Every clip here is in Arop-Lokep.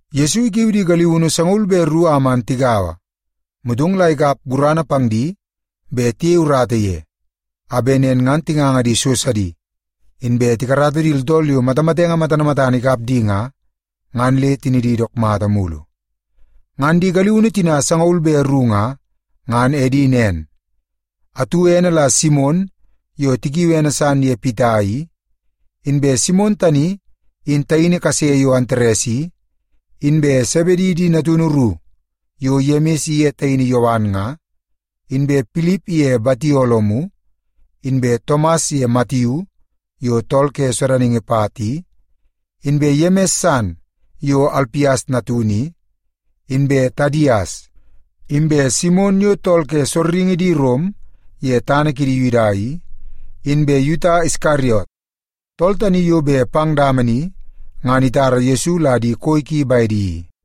Yesu ikiu di galiunu sangaul be ru a man tigaua, motong la ikap gurana pang di bet tiyei urata ye, a bet nen ngan tinganga di so sidi, inbe tikarata di tooltool yo matamatenge matana matana ikap di nga, ngan le tinidi dook mata mulu. Ngan di galiunu tina sangaul be ru nga, ngan edi nen: atu ene la Simon yo tikiui ene san ye Pita i; inbe Simon tani in taini kase yo Antares i; inbe Sebedi di natunu ru yo Yemis iye taini Yowan nga; inbe Pilip iye Batolomiu inbe Tomas ye Matiu yo tool ke sodaningi pat i; inbe Yemis san yo Alpias natunu i; inbe Tadias; inbe Simon yo tool ke sorringi di Rom ye tana kidi Yuda i; inbe Yuta Iskariot, tool tani yo bet pang dama ni ngan itara Yesu la di koi ki bedi i.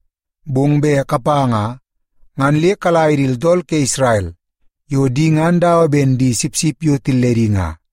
Bong bet kapa nga, ngan le kala ye di tooltool ke Isrel yo di ngan dawa ben di sipsip yo tilledi nga.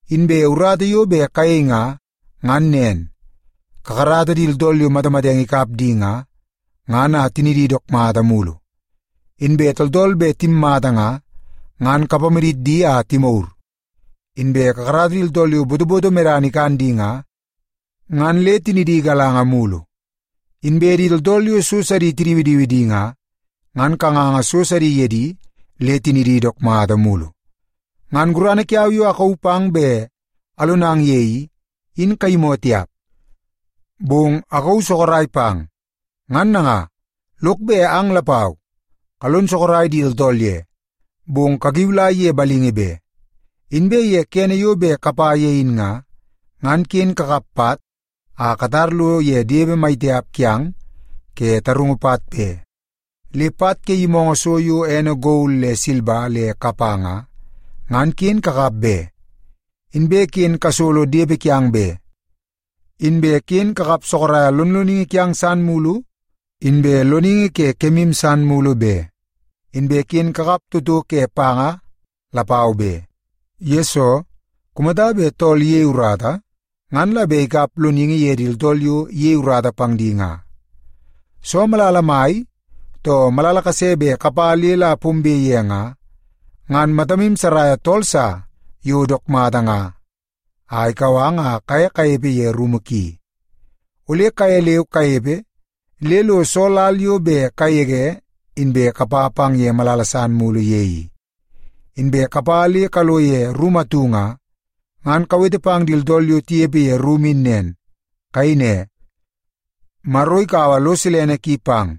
Inbe urata yo bet kayei nga, ngan nen. Kakarata di tooltool yo matamatenge ikap di nga, ngan a tinidi dook mata mulu. Inbe tooltool bet timmata nga, ngan kapamadit di a timagur. Inbe kakarata di tooltool yo botoboto medana ikan di nga, ngan le tinidi galanga mulu. Inbe di tooltool yo so sidi tidiwidiwi di nga, ngan kanganga so sidi ye di le tinidi dook mata mulu. Ngan gurana kiau yo akauu pang bet alonang ye i, in kayimoo tiap, bong akauu sorok pang. Ngan nanga, lok bet ang lapau kalon sorok di tooltool ye, bong kakiulai ye balingi be. Inbe ye kene yo bet kapa ye in nga, ngan ken kakap pat a katar lo ye depe mai tiap kiang ke tarungu pat be. Le pat ke yimoongoo so yo ene gol le silba le kapa nga, ngan ken kakap be. Inbe ken kasolo depe kiang be. Inbe ken kakap sorok lonloningi kiang san mulu, inbe loningi ke kemu san mulu be. Inbe ken kakap toto ke panga lapau be. Yesoo, kumata bet tool iyei urata, ngan la bet ikap loningi ye di tooltool yo iyei urata pang di nga. “Soo malala mai, too malala kase bet kapa le la pombe ye nga, ngan matamu saraia tool sa yo dook mata nga a ikau ang a kaye kanepe ye rumu ki. Ole kaye leu kanepe le lo soo lal yo bet kagege inbe kapa pang ye malala san mulu ye i. Inbe kapa le kalo ye rumu atu nga, ngan kawete pang di tooltool yo tinepe ye rumu in nen. Kayei ne, ‘Maro ikaua lo silene ki pang.’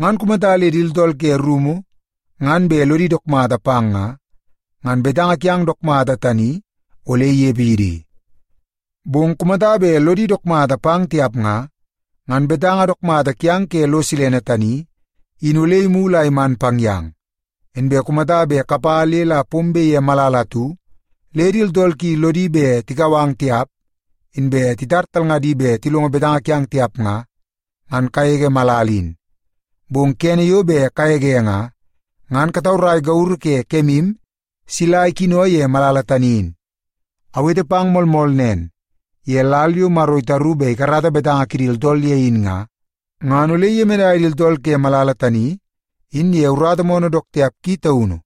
Ngan kumata le di tooltool ke rumu ngan bet lodi dook mata pang nga, ngan betanga kiang dook mata tani ole inepe ye di. Bong kumata bet lodi dook mata pang tiap nga, ngan betanga dook mata kiang ke lo silene tani, in ole imulu a iman pang yang. Inbe kumata bet kapa le la pombe ye malala atu, le di tooltool ki lodi bet tikau ang tiap, inbe titar talngadi bet tilongo betanga kiang tiap nga, ngan kagege malala in. Bong kene yo bet kagege nga, ngan kataurai gauru ke kemu sila ikino ye malala tani in. Awete pang moolmool nen, ye lal yo Maro itaru bet ikarata betanga kidi tooltool ye in nga, ngan ole iyemenai di tooltool ke malala tani in ye urata moonoo dook tiap ki taunu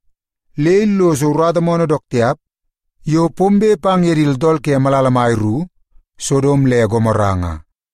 le illoso urata moonoo dook tiap yo bet pombe pang di tooltool ke malala mai ru, Sodom le Gomora nga.”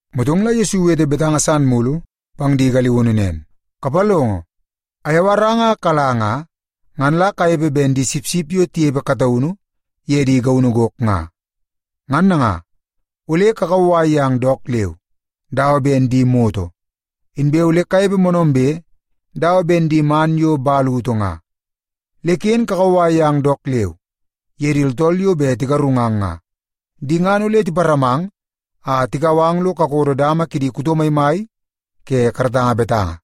Motong la Yesu iwete betanga san mulu pang di galiunu nen, “Kapalongo! Ayawarang a kala nga, ngan la kanepe ben di sipsip yo tinepe kataunu ye di gaunu gok nga. Ngan nanga, ole kakauwai yang dook leu dawa ben di moto, inbe ole kanepe moonoombe dawa ben di man yo utu nga. Le ken kakauwai yang dook leu ye di tooltool yo bet tigarungang nga. Di ngan ole tiparamang a tikau ang lo kakodo dama kidi kuto maimai ke karatanga betanga,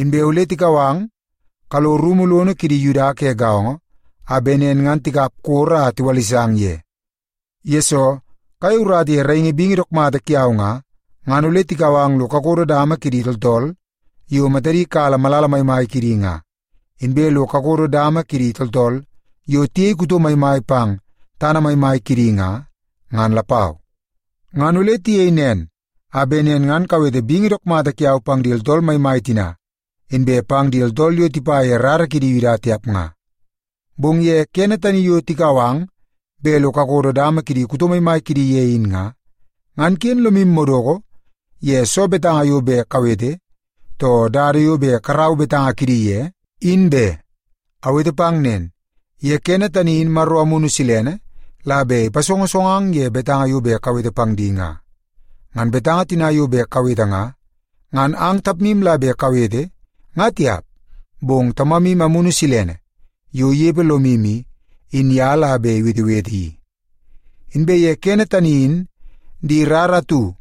inbe ole tikau ang kalo rumu lono kidi Yuda ke gaongo a bet nen ngan tikap koro a tiwalisang ye. Yesoo kayei urata ye raingi bingi dook mata kiau nga, ngan ole tikau ang lo kakodo dama kidi tooltool yo matadi kala malala maimai kidi nga, inbe lo kakodo dama ke di tooltool yo tiyei kuto maimai pang tana maimai kidi nga, ngan lapau. Ngan ole tiyei nen a bet nen ngan kawete bingi dook mata kiau pang di tooltool maimai tina, inbe pang di tooltool yo tipa ye di rara ke Yuda tiap nga. Bong ye kene tani yo tikau ang bet lo kakodo dama kidi kuto maimai kidi ye in nga, ngan ken lomu madoko ye soo betanga yo bet kawete, too dada yo bet karau betanga kidi ye, in be. Awete pang nen, ye kene tani in Maro Amunu Silene la bet ipasongosongang ye betanga yo bet kawete pang di nga. Ngan betanga tina yo bet kawete nga, ngan ang tapmu la bet kawete nga tiap, bong Tamamu Amunu Silene yo inepe lomu i, in ye la bet iwetewete i. “Inbe ye kene tani in di rara atu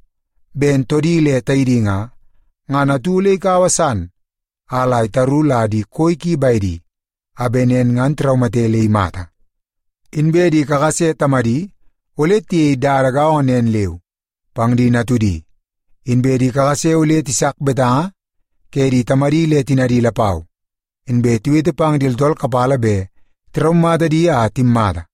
ben toodi le taidi nga, ngan atu ole ikaua san a itaru la di koi ki bedi, a bet nen ngan tiraumate le imata. Inbe di kakase tamadi ole tiyei dada gaongo nen leu pang di natudi. Inbe di kakase ole tisak betanga ke di tamadi le tinadi lapau, inbe tiwete pang di tooltool kapala bet la tiraumata di a timmata.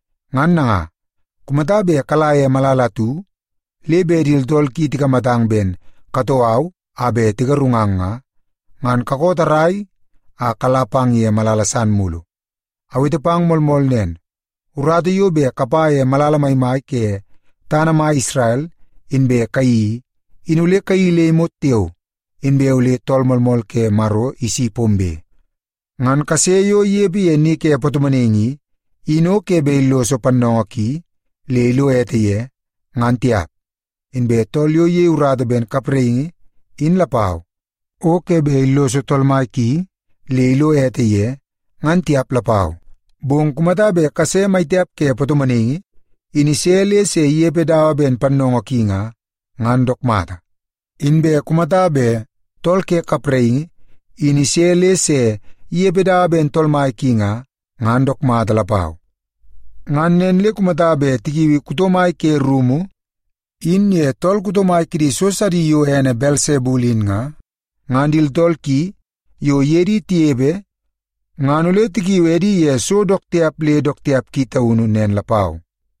Ngan nanga, kumata bet kala ye malala atu, le bet di tooltool ki tikamatang ben katoo au a bet tigarungang nga, ngan kakoo tarrai a kala pang ye malala san mulu. Awete pang moolmool nen, urata yo bet kapa ye malala maimai ke tana mai Isrel inbe kayeii i, in ole kayeii le imot tiao, inbe ole Tool Moolmool ke Maro isi pombe. “Ngan kase yo inepe ye ni ke patomonaingi i, in o ke bet illoso pannoongoo ki le ilo ete ye, ngan tiap. Inbe tool yo iyei urata ben kapraingi in lapau, o ke bet illoso tool mai ki le ilo ete ye, ngan tiap lapau. Bong kumata bet kase mai tiap ke patomonaingi in ise le se inepe dawa ben pannoongoo ki nga, ngan dook mata. Inbe kumata bet tool ke kapraingi in ise le se inepe dawa ben tool mai ki nga, ngan dook mata lapau. Ngan nen le kumata bet tikiui kuto mai ke rumu in ye tool kuto mai kidi so sidi yo ene Belsebul in nga, ngan di tooltool ki yo iye di tinepe ngan ole tikiu edi ye so dook tiap le dook tiap ki taunu nen lapau.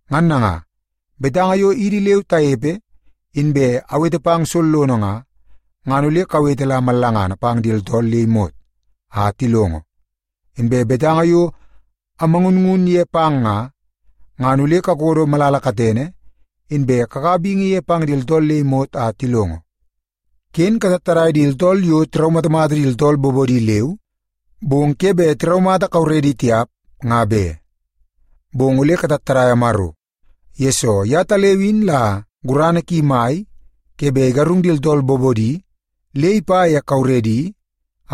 Ngan nanga, betanga yo idi leu tanepe inbe awete pang sollono nga, ngan ole kawete la mallangana pang di tooltool le imot a tilongo. Inbe betanga yo amangunngun ye pang nga, ngan ole kakodo malala katene, inbe kakaua bingi ye pang di tooltool le imot a tilongo. “Ken katattadai di tooltool yo tiraumatamata di tooltool bobodi leu, bong ke bet tiraumata kauredi tiap, nga be. Bong ole katattadaia Maro, yesoo yetaleu in la gurana ki mai ke bet igarung di tooltool bobodi le ipa ye kauredi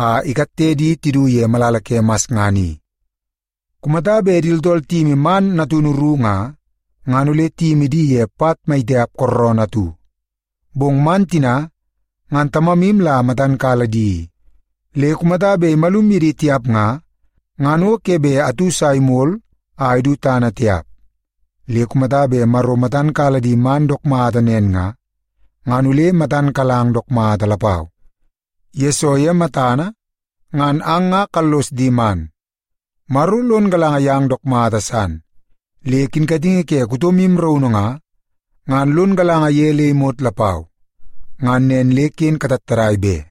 a ikatte di tidu ye malala ke masngana i. Kumata bet di tooltool tiyimi man natunu ru nga, ngan ole tiyimi di ye pat mai tiap kooroonoo atu. Bong man tina ngan Tamamu la matan kala di i, le kumata bet imalum ye di tiap nga, ngan o ke bet atu sa imol a idu tana tiap. Le kumata bet Maro matan kala di man dook mata nen nga, ngan ole matan kalang dook mata lapau, yesoo ye matana ngan ang nga kallos di man. Maro lon galanga yang dook mata san, le kinkatingi ke kutomu raunu nga, ngan lon galanga ye le imot lapau. Ngan nen le ken katattadai be!”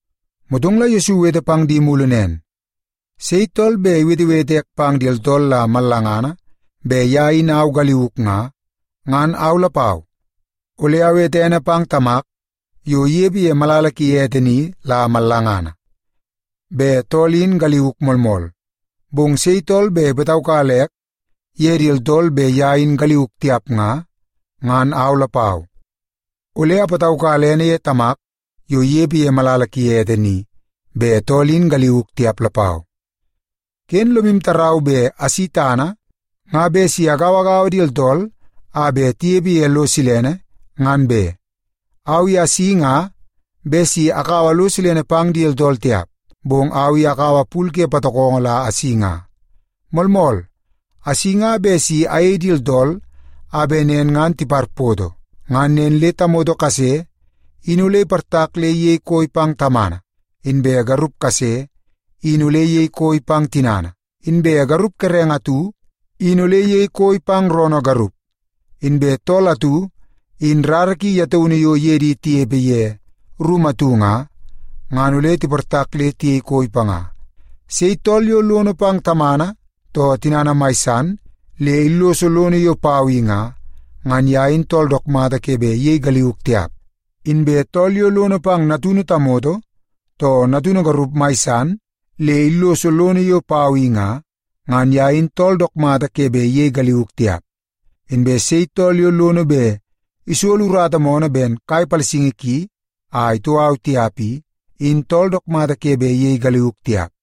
Motong la Yesu iwete pang di mulu nen, “Sei tool bet iwetewete ek pang di tooltool la mallangana bet ye in au galiuk nga, ngan au lapau, ole awete ene pang Tamak yo inepe ye malala ki ete ni la mallangana, bet tool in galiuk moolmool. Bong sei tool bet ipataukala ek ye di tooltool bet ye in galiuk tiap nga, ngan au lapau, ole apataukala ene ye Tamak yo inepe ye malala ki ete ni, bet tool in galiuk tiap lapau. “Ken lomu tarau bet asi tana nga bet si agauagaua di tooltool a bet tinepe ye lo silene, ngan be. Au i asi nga bet si akaua lo silene pang di tooltool tiap, bong au i akaua pul ke patokongo la asi nga. Moolmool, asi nga bet si ayei di tooltool a bet nen ngan tiparpoto. Ngan nen le ‘tamoto kase in ole iportak le iyei koi pang tamana, inbe garup kase in ole iyei koi pang tinana, inbe garup kerenge atu in ole iyei koi pang roonoo garup, inbe tool atu in rara ki ye taunu yo iye di tinepe ye rumu atu nga, ngan ole tiportak le tiyei koi panga.’ “Sei tool yo lono pang tamana too tinana mai san, le illoso lono yo pau i nga, ngan ye in tool dook mata ke bet iyei galiuk tiap. Inbe tool yo lono pang natunu tamoto too natunu garup mai san, le illoso lono yo pau i nga, ngan ye in tool dook mata ke bet iyei galiuk tiap. Inbe sei tool yo lono bet isolo urata moonoo ben kai palasingi ki a itoo au tiap i, in tool dook mata ke bet iyei galiuk tiap.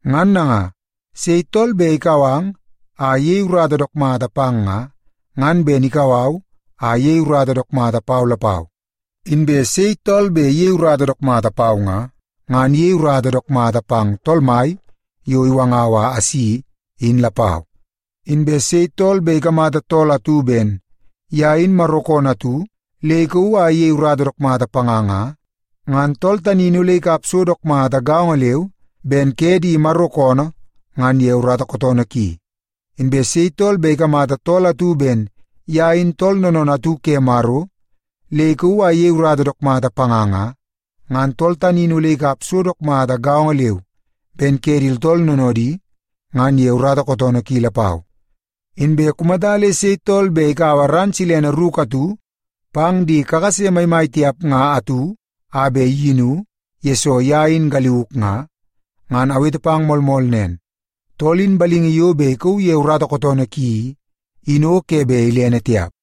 “Ngan nanga, sei tool bet ikau ang a iyei urata dook mata pang nga, ngan ben ikau au a iyei urata dook mata pau lapau. Inbe sei tool bet iyei urata dook mata pau nga, ngan iyei urata dook mata pang Tool Mai yo iwangau a asi, in lapau. Inbe sei tool bet ikamata tool atu ben ye in Maro koonoo atu le ikauu a iyei urata dook panga nga, ngan tool tani in ole ikap so dook mata gaongo leu ben ke di Maro koonoo ngan ye urata kootoonoo ki. Inbe sei tool bet ikamata tool atu ben ye in tool noonoonoo atu ke Maro le ikauu a iyei urata dook mata panga nga, ngan tool tani in ole ikap so dook mata gaongo leu ben ke di tooltool noonoodi ngan ye urata kootoonoo ki lapau. Inbe kumata le sei tool bet ikaua ran silene ruku atu pang di kakase maimai tiap nga atu a bet iyinu, yesoo ye in galiuk nga, ngan awete pang moolmool nen, tool in balingi yo bet ikauu ye urata kootoonoo ki i, in o ke bet ilene tiap.”